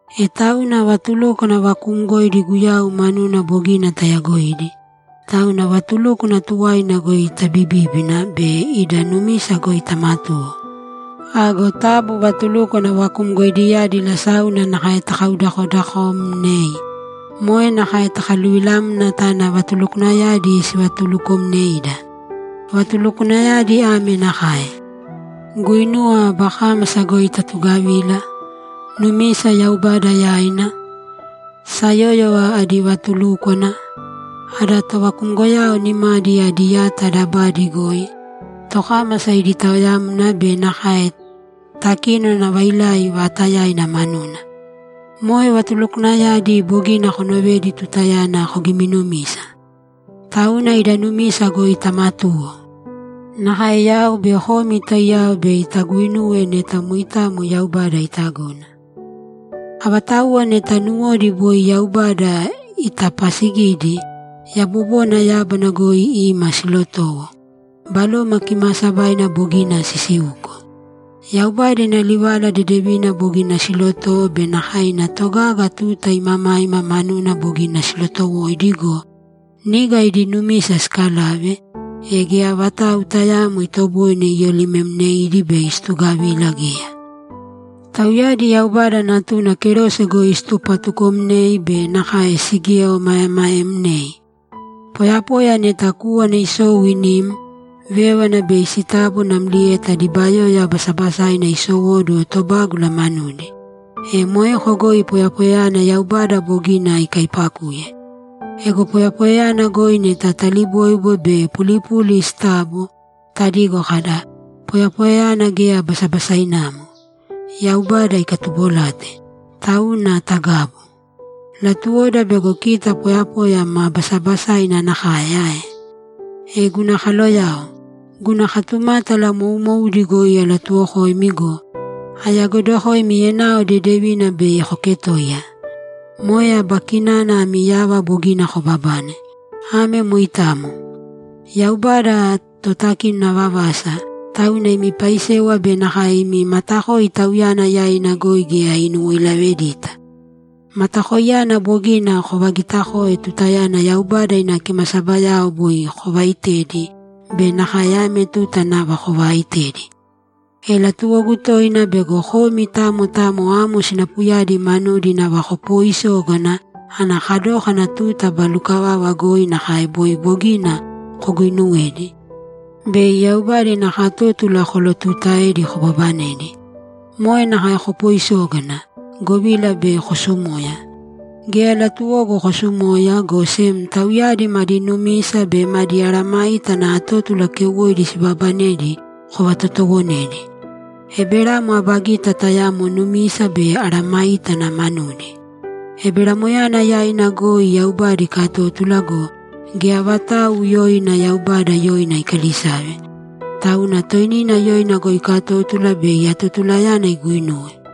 E tauna vatulúkwana vakuumgoidi Guyau manuna bogina tayagoidi, tauna vatulúkwana tuwaina goi tabibībina be ida numisa goi tamatūwo. Ago taabu vatulúkwana vakumgoidiyadi lasáuna nakae takaudakodaakomnēi. Moe nakae takaluvilamna tana vatulukwanayadi sivatulukomneida. Vatulukwanayadi ame nakae: Guinuwa aba kámasa goi tatugavila, numisa Yaubada yaina, sayóyova adi vatulúkwana, ada tovakumgoyao nimadi adi yata dabada goi, tokámasa idi taoyamna be nakae takínona vailai vaatayaina manuna. Moe vatulukwanayadi bogina konovedi tutayana kogiminumisa. Tauna ida numisa goi tamatūwo. Nakae yau be komi taiyao bei taguinuwe neta moitamo Yaubada itagona. Avatauwa neta nuwodi boi Yaubada itapasigidi, yabobona yábana goi ima silotowo, Baloma Kimaasabaina bogina sisiuko, Yaubada ina livala dedevina bogina silotowo be nakae ina togaga tuta imamaima manuna bogina silotowoidi go, niga idi numisa sikalave, e geya vatau tayaamo itoboine iyolimemneidi bei situgavila geya. Tauyadi Yaubada Natuna kerose goi situpatukomnei be nakae sigieomaemaemnei. Poyapoya neta kúwana isou inim, vévana bei sitabo namlieta dibayoya basabasaina isowóduwo tobágula manudi, e moeko goi poyapoyayana Yaubada bogina ikaipakuye. Ego poyapoyayana goi neta taliboibo be pulipuli sitabo, tadigo kada, ‘Poyapoyayana geya basabasainamo; Yaubada ikatubolate.’ Tauna tagabu. Latuwoda bego kita poyapoya ma basabasaina nakae ae? E guna kaloyao, guna katumátala moumoudi goi alatuuwokoimi go, ayagoidokoimi enao dedevina bei koketoiya. Moe aba kinana ami yava bogina kobabane. Ame moitamo. Yaubada Totakinona vavasa, tauna imi paisewa be nakae imi matakoi Tauyana yaina goi geya inuwoilavedita. Matakoiyana bogina kovagitakoe tutayana Yaubada ina kimasabayao boi kovaaitedi be nakae ame tuta nava kovaaitedi. E latuwogu toina bego komi tamo tamo amo sinapuyadi manudi nava kopooisógana ana kadókana tuta aba lukavava goi nakae boi bogina koguuinuwedi, bei Yaubada ina katótula kolotuutaedi kobabanedi. Moe nakae kopooisōgana, govila bei kosumoya. Geya latuwogu kosumoya, go sem tauyadi madi numisa be madi mesayágana atótula keuwoidi sibaabanedi kovatotoowonedi. Eberamo aba gita tayamo numisa be mesayágana manudi. Eberamoyana yaina goi Yaubada ikatótula go, geya vatau yoina Yaubada yoina ikalisave, tauna toinina yoina goi ikatótula bei atotulayana iguinuwe.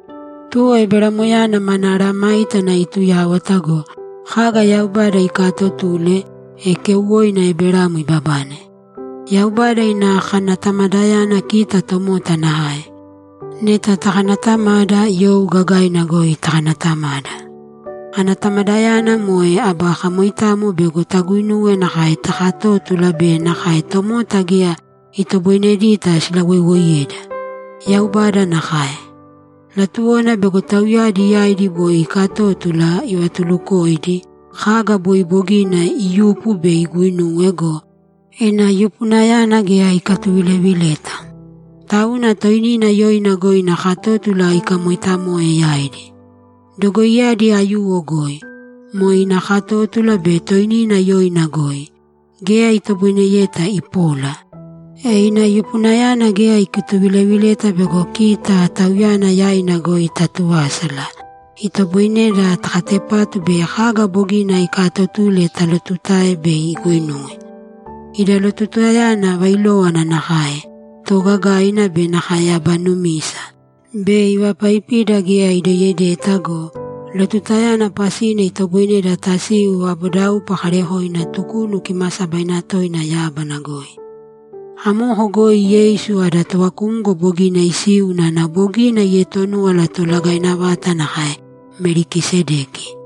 Tuwo Eberamoyana mana mesayágana ituyáwata go, kaga Yaubada ikaatotule, e keuwoina Eberamo ibabane. Yaubada ina kanatamadayana kita tomota nakae. Neta takanatamada, you gagaina goi takanatamada. Anatamadayana moe aba kamoitamo bego taguinuwa nakae takatótula be nakae tomota geya itoboinedita silawoiwoiyeda. Yaubada nakae. Latuwona bego tauyadi yaidi boi iikatótula ivatulukodokoidi kaga boi bogina iyupu bei iguinuwe go, ina yupunayana geya ikatuvilevileta. Tauna toinina yoina goi ina katótula ikamoitamoe yaidi. Dogoiyadi aiyuwo goi, moe ina katótula be toinina yoina goi, geya itoboineyeta ipola. E ina yupunayana geya ikatuvilevileta bego kita, Tauyana yaina goi taatuvásala, itoboineda takatepatu bei kaga bogina ikaatotule talotutae bei iguinuwe. Ida lotutayana vailówana nakae, toogagaina be nakae aba numisa, bei ivapaipida geya idoiyedeta go, lotutayana pasina itoboineda tasiu vabodaupa kaarekoina Tukunu Kimaasabaina Toina yábana goi. Amoko goi Yeisu ada tovakumgo bogina isiu unana bogina ietonúwala toolagaina vata nakae Melikisedeki.